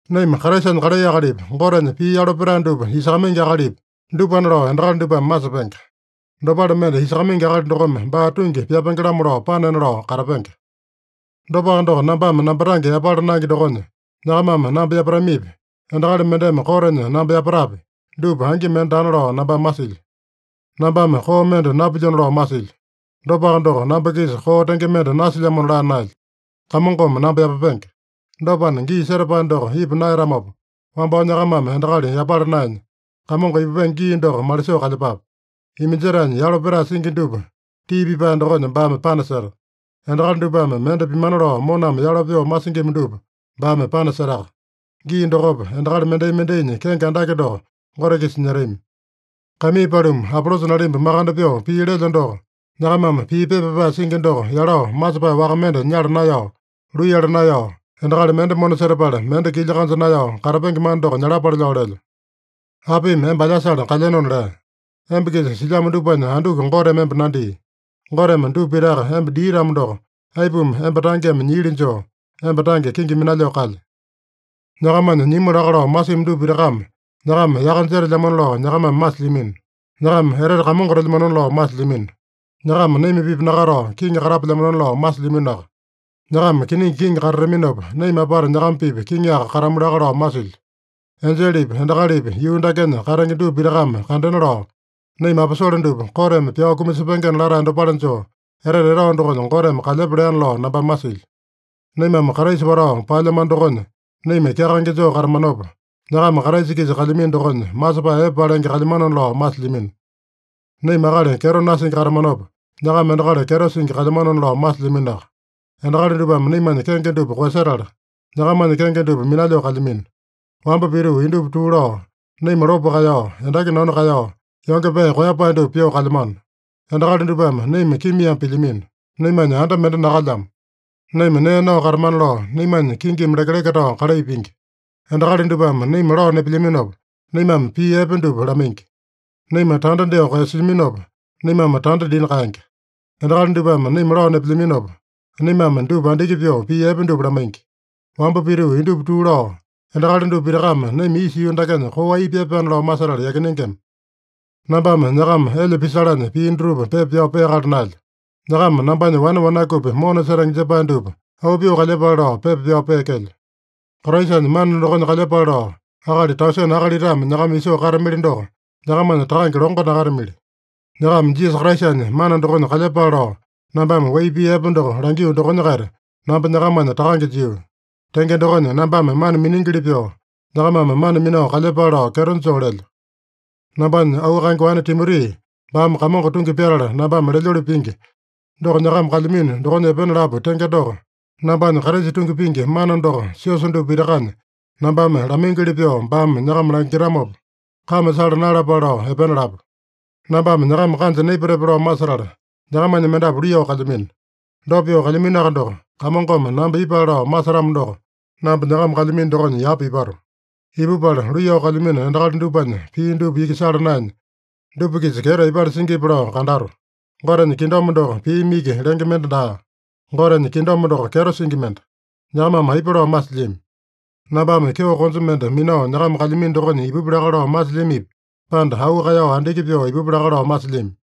Naima Kraisanya kalai akalipi, Gotenya pii yalo petae dupa isakamaingi akalipi, dupana lao endakali dupame masepenge. Dopale mende isakamaingi akali dokome baa tungi pyapenge-lamo lao panena lao katapenge. Dopaka doko, nambame namba tange yapala naenge dokonya, nyakamame namba yapatamipi, endakali mendeme kotenya namba yapatapi, dupa angi mende daana lao nambame masilyo. Nambame koo mende napilyona lao masilyo. Dopaka doko, namba-kisa koo tenge mende nasilyamona laa naelyo. Kamongome namba yapapenge. Dopana, gii setapae doko ipa naeyatamopa, wambao nyakamame endakali yapala naenya, Kamongo ipupenge gii doko malisoo kalyepape. Iminjetaenya yalo petae singi dupa tii pipae dokonya baame panaseta. Endakali dupame mende pimana lao moname yalo pyoo masingima dupa baame panasetaka. Gii dokopa, endakali mendai-mendainya kenge andake doko Gote-kisa nyetami. Kaimii paluma, Apolosa nalimba makande pyoo pii lelyo doko, nyakamame pii pepa pyapae singi doko yalao masepae waka mende nyala naeyao, luiyala naeyao, endakali mende mona setapala mende kilya kanja naeyao katapenge mana doko nyalapale lao lelyo. Apimi emba alyasale kalyenona lea? Emba-kisa silyamo dupanya anduku Goteme emba nandia? Goteme dupa pitaka emba dia-tamo doko, aipuma emba tangeme nyiili joo, emba tange kenge minalyoo kalye? Nyakamanya nyimu laka lao masimi dupa pitakame nyakama yaka jetelyamano lao nyakamame masilyamino. Nyakama etete kamongotelyamano lao masilyamino. Nyakama naima-pipa nakatao, kiŋi katapelyamano lao masilyaminoaka. Nyakama kiningi kiŋi katataminopa, naima apata nyakama-pipa kiŋiaka katamu laka lao masilyo. Enjelepi, endakalipi, yuu dakenya katenge dupa pitakame kandena lao, naima aposole dupa koteme pyao kumasepengena latae dopale joo, etete etao dokonya Goteme kalyepa leana lao nambame masilyo. Naimame Kraisa watao paelyamano dokonya naima kyakaenge joo katamanopa, nyakama Kraisa-kisa kalyamino dokonya masepae epe palenge kalyamanona lao masilyamino. Naima akali kyeto nasingi katamanopa, nyakama endakali kyeto singi kalyamanona lao masilyaminoaka. Endakali dupame naimanya kenge dupa koeyasetala, nyakamanya kenge dupa minalyoo kalyamino. Wamba pituu indupa tuu lao, naima lopo kaeyao, endaki nanu kaeyao, yonge pee koeyapae dupa pyoo kalyamano. Endakali dupame naima kimiame pilyamino. Naimanya anda mende nakalyamo. Naima nee nao katamana lao naimanya kingimi lekeleke tao kalai pingi. Endakali dupame naima lao nepelyaminopa, naimame pii epe dupa lamaingi. Naima tanda dyoo koeyasilyaminopa, naimame tanda dina kaenge. Endakali dupame naima lao nepelyaminopa, naimame dupa andiki pyoo pii epe dupa lamaingi. Wamba pituu indupa tuu lao, endakali dupa pitakame naima isa yuu dakenya koo ai pyapaena lao masetala yakinengema. Nambame nyakama elya pisalanya pii dutupa pepa pyao peakala naelyo. Nyakama nambanya wane wanakupi mona setenge jepae dupa auu pyoo kalyepale lao pepa pyao peekelyo. Kraisanya mana dokonya kalyepale lao akali tausene akalitame nyakama isoo katamili doko, nyakamanya takange longo nakatamili. Nyakama Jisasa Kraisanya mana dokonya kalyepale lao, nambame wai pii epe doko langio dokonya-kaita, namba nyakamanya takange jio. Tenge dokonya, nambame mana miningili pyoo, nyakamame mana minao kalyepale lao kyeto joo lelyo. Nambanya auu kaenge wane Timoti, baame Kamongo tungi pyatala nambame lelyoli pingi, doko nyakama kalyamino dokonya epena lapu tenge doko, nambanya Kraisa tungi pingi mana doko siosa dupa pitakanya nambame lamaingili pyoo baame nyakama langitamopa, kame sala naeyalapale lao epena lapu. Nambame nyakama kanja naipatepe lao masetala, nyakamanya mendapu luiyao kalyamino. Dopa pyoo kalyaminoaka doko, Kamongome namba ipale lao masetamo doko, namba nyakama kalyamino dokonya yapa ipato. Ipupala, luiyao kalyamino endakali dupanya pii dupa iki sala naenya, dupa-kisa kyeto aipale singipi lao kandato. Gotenya kingdom doko piimi iki lenge mende daa. Gotenya kingdom doko kyeto singi mende. Nyakamame aipa lao masilyami? Nambame kyeo konja mende minao nyakama kalyamino dokonya ipupi laka lao masilyamipi, pande auu kaeyao andiki pyoo ipupi laka lao masilyami?